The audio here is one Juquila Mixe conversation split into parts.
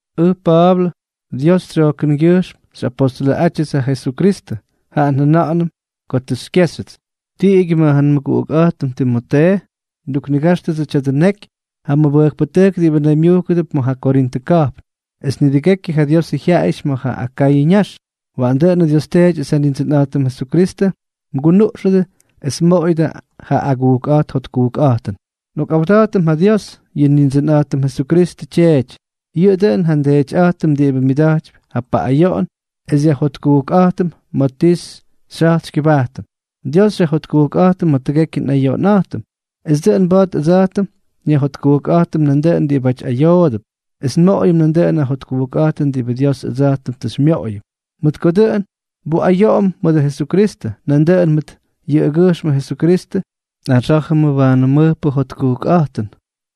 Ʉj Pa̱a̱blʉ. Dios tsyojkʉngyʉjxm xyꞌapostʉlʉꞌátyʉts ja Jesukristʉ, jaꞌa njʉna̱ꞌa̱nʉm ko tʉ xykyéxyʉts. Tiꞌigyʉ mʉt ja nmʉguꞌukꞌa̱jtʉm Timotee nduknigáxtʉdsʉ tya̱dʉ neky ja mʉbʉjkpʉtʉjk diꞌibʉ naymyujkʉdʉp ma̱ ja Korintʉ ka̱jpn, es nidʉgekyʉ ja Diosʉ jyaꞌayʉty ma̱ ja Akayʉ ñax. Waꞌanʉ Dios Teety es ja Nindsʉnꞌa̱jtʉm Jesukristʉ mgunuꞌxʉdʉ es mmoꞌoyʉdʉ ja agujkꞌa̱jt jotkujkꞌa̱jtʉn. Nꞌokꞌawda̱jtʉm ja Dios, yʉ Nindsʉnꞌa̱jtʉm Jesukristʉ Tyeety. Yʉꞌʉ dʉꞌʉn ja nDeetyꞌa̱jtʉm diꞌibʉ myʉda̱jtypy ja paꞌꞌayoꞌon es xyajjotkujkꞌa̱jtʉm pʉn ti xyja̱jt xykyʉbajtʉm. Dios xyajjotkujkꞌa̱jtʉm ma̱ tʉgekyʉ nꞌayoꞌonꞌa̱jtʉm, es dʉꞌʉn mba̱a̱t ʉdsa̱jtʉm nyajjotkujkꞌa̱jtʉm nandʉꞌʉn diꞌibáty ayoodʉp, es nmoꞌoyʉm nandʉꞌʉn ja jotkujkꞌa̱jtʉn diꞌibʉ Dios ʉdsa̱jtʉm tʉ xymyoꞌoyʉm. Mʉt ko dʉꞌʉn nbuꞌayoꞌom mʉdʉ Jesukristʉ, nandʉꞌʉn mʉt yʉꞌʉgyʉjxmʉ Jesukristʉ nꞌaxá̱jʉmʉ waanʉ mʉjpʉ jotkujkꞌa̱jtʉn.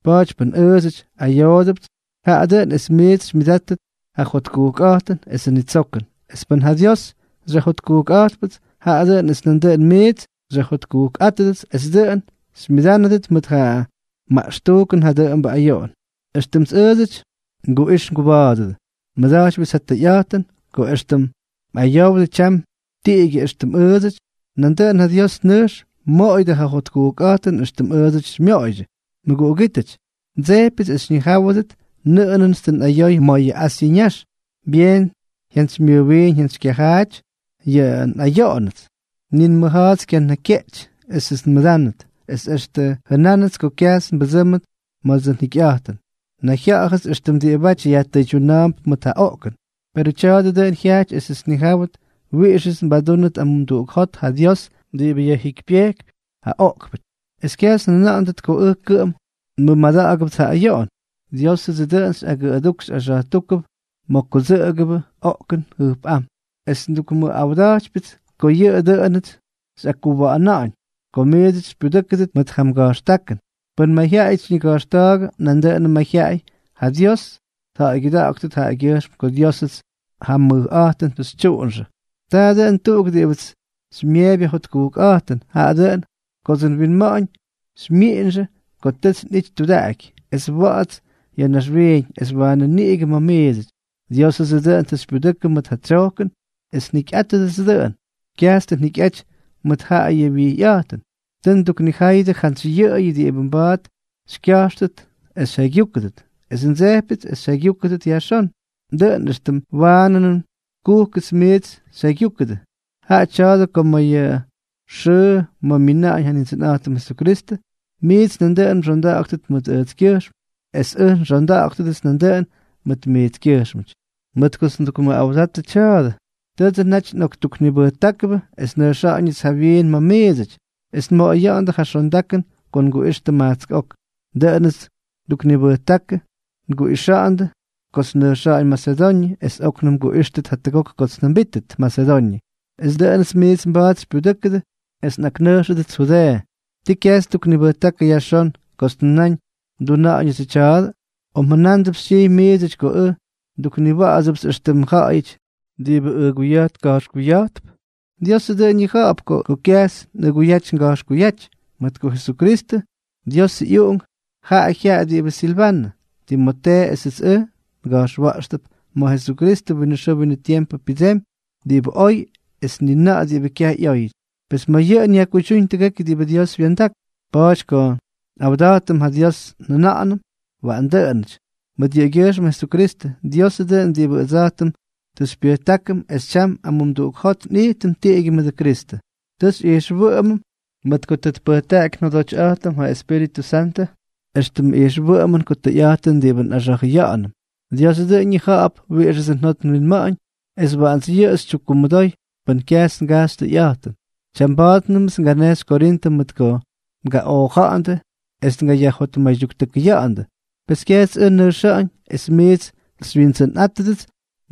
Pa̱a̱ty pʉn ʉʉdsʉty ayoodʉpts, jaꞌa dʉꞌʉn es miits xymyʉdátʉt ja jotkujkꞌa̱jtʉn esʉ nitsokʉn; es pʉn ja Dios xyajjotkujkꞌa̱jtpʉts, jaꞌa dʉꞌʉn es nandʉꞌʉn miits xyajjotkujkꞌa̱jtpʉdʉt es dʉꞌʉn xymyʉdánʉdʉt mʉt ja maꞌxtujkʉn ja dʉꞌʉmbʉ ayoꞌon, éxtʉmts ʉʉdsʉty nguꞌix nguba̱a̱dʉdʉ. Nmʉda̱jtypyʉts ja tʉyꞌa̱jtʉn, ko éxtʉm mꞌayowdʉ tyam tiꞌigyʉ éxtʉm ʉʉdsʉty, nandʉꞌʉn ja Dios nʉjx mmoꞌoyʉdʉ ja jotkujkꞌa̱jtʉn éxtʉmts ʉʉdsʉty xymyoꞌoydyʉ. Mʉguꞌugítʉty, ndsejpyʉts es xyñijáwʉdʉt nʉꞌʉnʉts tʉ nꞌayoy ma̱ yʉ Asyʉ ñax. Byeen jyantsymyʉjwiin jyantsykyajaajʉty tʉ nꞌayóyʉts, ni nmʉja̱a̱ts kyanakykyeꞌty esʉts nmʉdánʉt, es extʉ jʉnánʉts ko kyajts nbʉdsʉ́mʉt mʉdʉdsʉ njikyꞌa̱jtʉn. Nayjya̱ꞌa̱jʉts éxtʉm diꞌibáty yajtʉydyuna̱a̱mp mʉt ja oꞌkʉn. Perʉ tya̱a̱dʉ dʉꞌʉn jyajty esʉts nnijáwʉt wiꞌixʉts nbadúnʉt amumduꞌuk jot ja Dios diꞌibʉ yajjikypyejkypy ja oꞌkpʉty, es kyajts njʉna̱ꞌa̱nʉt ko ʉj kʉꞌʉm nmʉmada̱ꞌa̱gʉpts ja ayoꞌon. Diósʉdsʉ dʉꞌʉn xyꞌagʉꞌʉdujk xyꞌaxa̱jtujkp ma̱ kudsʉꞌʉgʉbʉ oꞌkʉn jʉjpꞌám, es ndukmʉꞌawda̱jtypyʉts ko yʉꞌʉ dʉꞌʉnʉts xyꞌakkuwa̱ꞌa̱na̱ꞌa̱ñ ko miits xypyudʉ́kʉdʉt mʉt ja mga̱jxtákʉn. Pʉn mayjyaꞌayʉts xyñiga̱jxta̱a̱gʉ, nandʉꞌʉn mayjyaꞌay ja Dios tja̱ꞌa̱ygyʉda̱ꞌa̱ktʉt jaꞌagyʉjxm ko Diósʉts ja mʉj mayꞌa̱jtʉn tʉ xytyuunʉ. Taa dʉn tuꞌuk diꞌibʉts xymyeepy ja jotkujkꞌa̱jtʉn, jaꞌa dʉꞌʉn kodsʉ nwinma̱ꞌa̱ñ xymyiꞌinxʉ ko tʉts nꞌity tudaꞌaky es wa̱ꞌa̱ts ya̱ naxwiiñ, es waanʉ niꞌigʉ ma̱ miidsʉty. Diósʉdsʉ dʉꞌʉn tʉ xypyudʉkʉ mʉt ja tsyojkʉn es njikyꞌátʉdʉts dʉꞌʉn. Kyajts tʉ njikyꞌaty mʉdʉ ja̱ꞌa̱yʉ wyijyꞌa̱jtʉn. Tʉ nduknijáyʉdʉ jantsy yʉꞌʉyʉ diꞌibʉ mba̱a̱t xykya̱jxtʉt es xyjaygyúkʉdʉt. Es ndsejpyʉts es xyjaygyúkʉdʉt yajxón, dʉꞌʉn éxtʉm waanʉnʉm kujkʉts miits xyjaygyúkʉdʉ. Jaꞌa tya̱a̱dʉ ko ma̱ ja xʉʉ ma̱ myina̱ꞌa̱ñ ja Nindsʉnꞌa̱jtʉm Jesukristʉ, miits nandʉꞌʉn mxonda̱ꞌa̱ktʉt mʉt ʉjtskyʉjxm, es ʉj nxonda̱ꞌa̱gʉdʉts nandʉꞌʉn mʉt miitskyʉjxmʉty. Mʉt kots ndukmʉꞌawdatʉ tya̱a̱dʉ, tʉdsʉ naty nꞌoktuknibʉjtákʉbʉ es nnʉjxa̱ꞌa̱ñʉts jawyiin ma̱ miidsʉty, es nmoꞌoya̱ꞌa̱ndʉ ja xondakʉn ko nguꞌixtʉ majtsk ok. Dʉꞌʉnʉts nduknibʉjtákʉ nguꞌixa̱ꞌa̱ndʉ kots nnʉjxa̱ꞌa̱ñ Masedoñʉ, es óknʉm nguꞌíxtʉt jatʉgok kots njʉmbítʉt Masedoñʉ, es dʉꞌʉnʉts miits mba̱a̱t xypyudʉ́kʉdʉ es nꞌaknʉjxʉdʉts Judeeʉ. ¿Tii kyajts nduknibʉjtákʉ yajxón kots njʉnáñ nduna̱ꞌa̱ñʉdsʉ tya̱a̱dʉ? ¿O mjʉnándʉp xytyijy miidsʉty ko ʉj ndukniwa̱a̱bʉts éxtʉmʉ ja̱ꞌa̱yʉty diꞌibʉ ʉguya̱jt ka̱jxkuya̱jtp? Diosʉ dʉꞌʉn ñija̱ꞌa̱p ko ʉj kyajts nꞌʉguyaty nga̱jxkuyáty. Mʉt ko Jesukristʉ, Diosʉ ꞌyUꞌunk, jaꞌa jyaꞌa diꞌibʉ Silvanʉ, Timotee esʉts ʉj nga̱jxwa̱ꞌxtʉp, ma̱ Jesukristʉ winʉ xʉʉ winʉ tiempʉ pyʉdsemy diꞌibʉ oy es ni na̱ꞌa̱ diꞌibʉ kyaj ꞌyóyʉty. Pes ma̱ yʉꞌʉn yajkuydyúñ tʉgekyʉ diꞌibʉ Dios wya̱ndak. Pa̱a̱ty ko nꞌawda̱jtʉm ja Dios njʉna̱ꞌa̱nʉm “waꞌan dʉꞌʉnʉty” mʉt yʉꞌʉgyʉjxmʉ Jesukristʉ. Diosʉ dʉꞌʉn diꞌibʉ ʉdsa̱jtʉm tʉ xybyʉjtákʉm es tyam amumduꞌuk jot nꞌijtʉm tiꞌigyʉ mʉdʉ Kristʉ. Tʉ xyꞌijxwʉꞌʉmʉm, mʉt ko tʉ tpʉjtaꞌaky njodotyꞌa̱jtʉm ja Espíritʉ Santʉ éxtʉmʉ ijxwʉꞌʉmʉn ko tʉyꞌa̱jtʉn diꞌibʉ nꞌaxa̱jʉya̱ꞌa̱nʉm. Diosʉ dʉꞌʉn ñija̱ꞌa̱p wiꞌixʉdsʉ njot nwinma̱ꞌa̱ñ, es waꞌants yʉꞌʉ xytyukkumʉdoy pʉn kyajts ngajxy tʉyꞌa̱jtʉn. Tyamba̱a̱tnʉmts nganejxy Korintʉ mʉt ko ngaꞌooja̱ꞌa̱ndʉ es ngayajjotmaydyuktʉkʉya̱ꞌa̱ndʉ. Pes kyajts ʉj nnʉjxa̱ꞌa̱ñ es miits xywyindsʉnꞌáttʉdʉts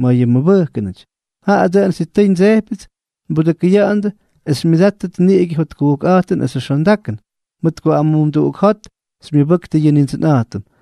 ma̱ yʉ mmʉbʉjkʉnʉty; jaꞌa dʉꞌʉn sitʉy ndsejpyʉts nbudʉkʉya̱ꞌa̱ndʉ es xymyʉdáttʉt niꞌigʉ jotkujkꞌa̱jtʉn esʉ xondakʉn, mʉt ko amumduꞌuk jot xymyʉbʉktʉ yʉ Nindsʉnꞌa̱jtʉm.